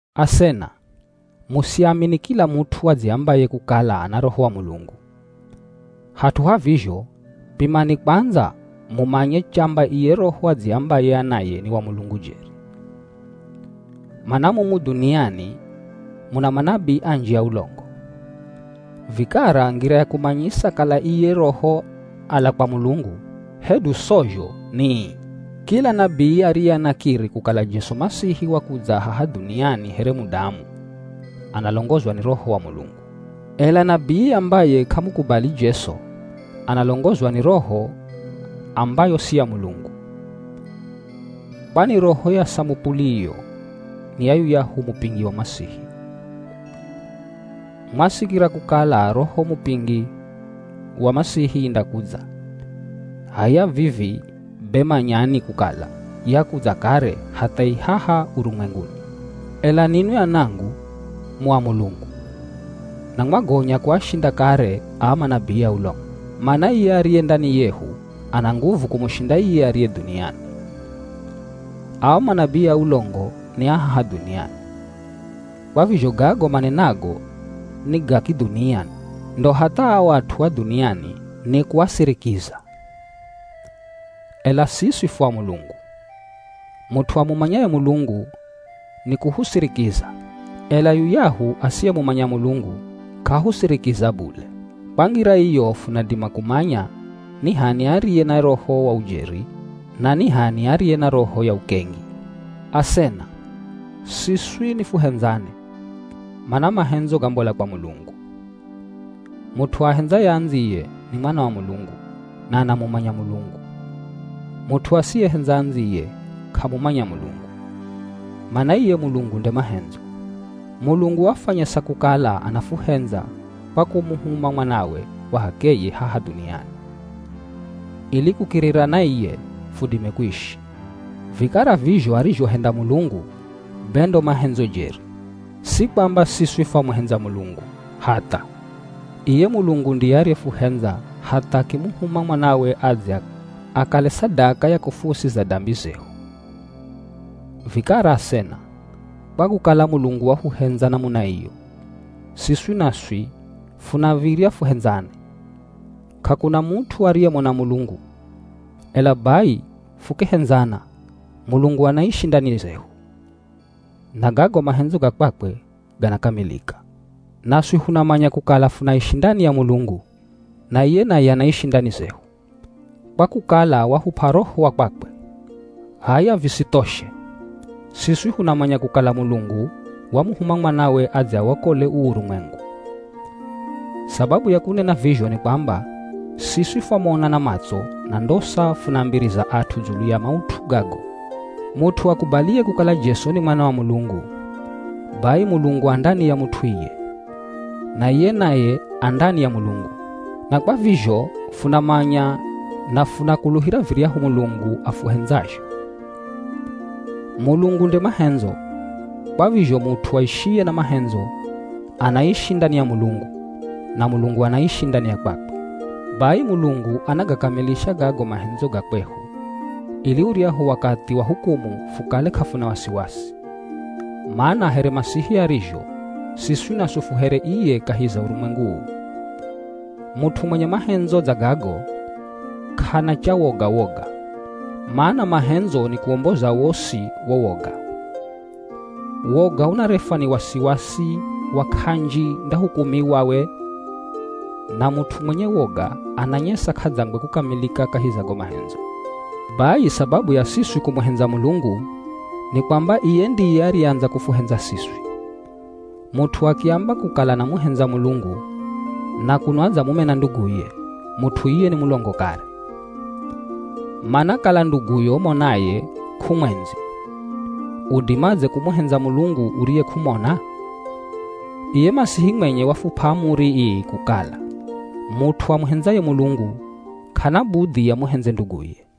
Asena, musiamini kila mut'u adziambaye kukala ana Roho wa Mulungu. Hat'u ha vizho, pimani kwandza mumanye chamba iye roho adziambaye anaye ni wa Mulungu jeri. Mana mumu dhuniani muna manabii anji a ulongo. Vikara ngira ya kumanyisa kala iye roho ala kwa Mulungu hedu sozho ni ii: Kila nabii ariye anakiri kukala Jesu Masihi wakudza haha dhuniani here mudamu, analongozwa ni Roho wa Mulungu. Ela nabii ambaye k'amukubali Jesu, analongozwa ni roho ambayo si ya Mulungu. Kwani roho ya samupuli iyo ni ya yuyahu mupingi wa Masihi. Mwasikira kukala roho mupingi wa Masihi indakudza, h'aya vivi be manyani kukala yakudza kare hatha i haha urumwenguni. Ela ninwi anangu, mu a Mulungu, na mwagonya kuashinda kare aa manabii a ulongo. Mana iye ariye ndani yehu, ana nguvu kumushinda iye ariye dhuniani. Ao manabii a ulongo ni a haha dhuniani, kwa vizho gago manenago ni ga kidhunia ndo hatha ao at'u a dhuniani ni kuasirikiza. Ela siswi fu a Mulungu. Mut'u amumanyaye Mulungu ni kuhusirikiza, ela yuyahu asiyemumanya Mulungu k'ahusirikiza bule. Kwa ngira iyo funadima kumanya ni h'ani ariye na Roho wa jeri na ni h'ani ariye na roho ya ukengi. Asena, siswi nifuhendzane, mana mahendzo gambola kwa Mulungu. Mut'u aahendzaye andziye ni mwana wa Mulungu na anamumanya Mulungu. Mut'u asiyehendza andziye, k'amumanya Mulungu, mana iye Mulungu nde mahendzo. Mulungu wafwanyesa kukala anafuhendza kwa kumuhuma Mwanawe wa h'akeye haha dhuniani, ili kukirira na iye fudime kuishi. Vikara vizho arizhohenda Mulungu, be ndo mahendzo jeri. Si kwamba siswi fwamuhendza Mulungu, hatha, iye Mulungu ndiye ariyefuhendza hatha akimuhuma Mwanawe adze akale sadaka ya kufuusiza dambi zehu. Vikara asena, kwa kukala Mulungu wafuhendza namuna iyo, siswi naswi funav̱irya fuhendzane. K'akuna mut'u ariyemona Mulungu, ela bai fukihendzana, Mulungu anaishi ndani zehu, na gago mahendzo ga kwakwe ganakamilika. Naswi funamanya kukala funaishi ndani ya Mulungu, na iye naye anaishi ndani zehu, kwa kukala wahup'a Roho wa kwakwe. H'aya visithoshe, siswi funamanya kukala Mulungu wamuhuma Mwanawe adze awokole uu urumwengu. Sababu ya kunena vizho ni kwamba siswi fwamona na matso na ndosa funaambiriza at'u dzulu ya maut'u gago. Mut'u akubaliye kukala Jesu ni Mwana wa Mulungu, bai Mulungu a ndani ya mut'u iye, na iye naye a ndani ya Mulungu. Na kwa vizho funamanya na funakuluhira viryahu Mulungu afuhendzazho. Mulungu nde mahendzo, kwa vizho mut'u aishiye na mahendzo, anaishi ndani ya Mulungu, na Mulungu anaishi ndani ya kwakwe. Bai Mulungu anagakamilisha gago mahendzo ga kwehu, ili uryahu wakathi wa hukumu fukale k'afuna wasiwasi, mana here Masihi arizho, siswi naswi fu here iye kahi za urumwengu uu. Mut'u mwenye mahendzo dza gago, k'ana cha woga-woga, mana mahendzo ni kuwomboza wosi wo woga. Woga unarefwa ni wasiwasi wa “k'anji ndahukumiwa we.” Na mut'u mwenye woga ananyesa k'adzangwe kukamilika kahi za go mahendzo. Bai sababu ya siswi kumuhendza Mulungu ni kwamba iye ndiye ariyeandza kufuhendza siswi. Mut'u akiamba kukala anamuhendza Mulungu, na kuno adzamumena nduguye, mut'u iye ni mulongo kare. Mana kala nduguyo umonaye, k'umwendzi, udimadze kumuhendza Mulungu uriye k'umona? Iye Masihi mwenye wafup'a amuri ii kukala mut'u amuhendzaye Mulungu, k'ana budhi amuhendze nduguye.